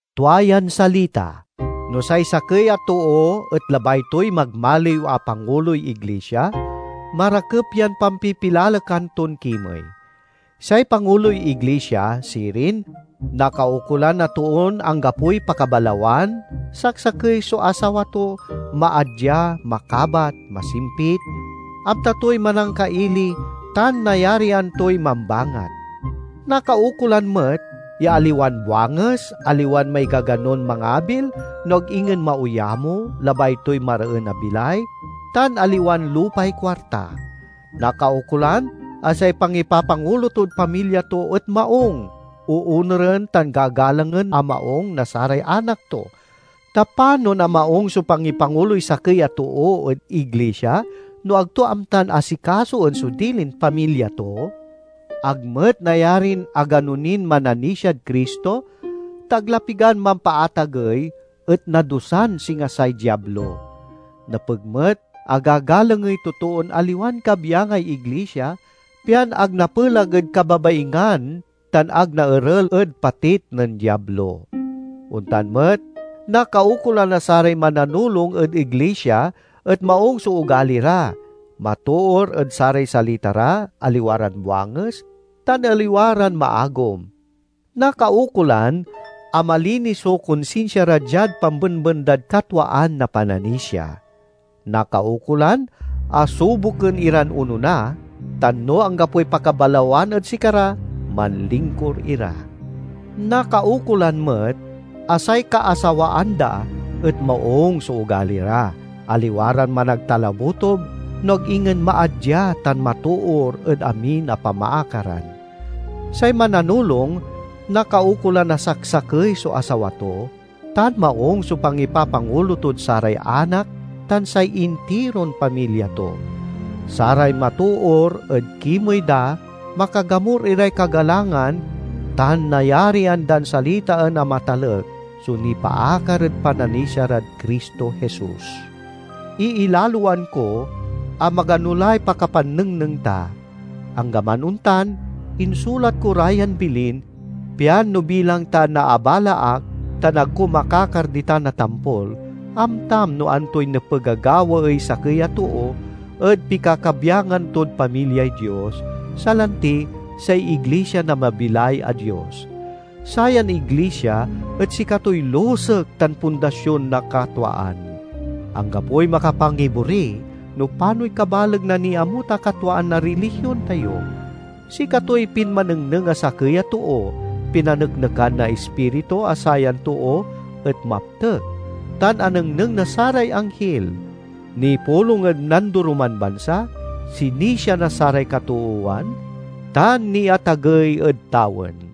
Tua yan salita: No say sakey a too et labay toy magmaliw a panguloy iglisia, marakep yan pampipilalekan ton kimey. Say panguloy iglisia, sirin, nakaukolan a toon anggapoy pakabalawan, saksakey so asawa to, maadya, makabat, masimpit, amta toy manangkaili, tan nayarian toy mambangat. Nakaukolan met ya aliwan buanges, aliwan maigaganon mangabil, no ag ingen maoyamo, labay toy mareen a bilay, tan aliwan lupay kuarta. Nakaukolan a say pangipapangulo tod pamilya to et maung, oonuren tan gagalangen a maung na saray anak to. Ta panon a maung so pangipanguloy sakey a too ed iglisia, no ag to amtan asikasoen so dilin pamilya to? Ag met nayarin agano nin mananisiad Cristo, ta ag la pigan mampaatagey, et nadusan singa say Diablo. Nepeg met a gagalangey totoon aliwan kabyangay iglisia, pian ag napelag ed kababaingan tan ag naerel ed patit nen Diablo. Ontan met, nakaukolan a saray mananulong ed iglisia et maung so ogali ra, matoor ed saray salita ra, aliwa ran buanges, tan aliwa ran maagom. Nakaukolan a malinis so konsinsia ra diad pambenben dad katwaan na pananisia. Nakaukolan a suboken iran onona, tan no anggapoy pakabalawan ed sikara, manlingkur ira. Nakaukolan met a say kaasawaan da et maung so ogali ra, aliwa ran managtalabutob, no ag ingen maadya tan matoor ed amin a pamaakaran. Say mananulong nakaukolan a saksakey so asawa to, tan maung so pangipapangulo tod saray anak tan say intiron pamilya to. Saray matoor ed kimey da makagamur iray kagalangan tan nayarian dan salitaen a matalek so nipaakar ed pananisia rad Cristo Jesus. Iilaloan ko a magano lay pakapannengneng ta. Anggaman ontan, insulat ko ra yan bilin, pian no bilang ta naabala ak tan ag ko makakar ditan a tampol, amtam no antoy nepeg a gawaey sakey a too ed pikakabyangan tod pamilyay Dios, salanti say iglisia na mabilay a Dios. Sayan iglisia et sikatoy lusek tan pundasion na katwaan. Anggapoy makapangibori no panoy kabaleg na niamut a katwaan na rilihion tayo. Sikatoy pinmanengneng a sakey a too, pinaneknekan na Ispiritu a sayan too et maptek, tan anengneng na saray anghil. Nipulong ed nandoroman bansa, sinisia na saray katoowan, tan niatagey ed tawen.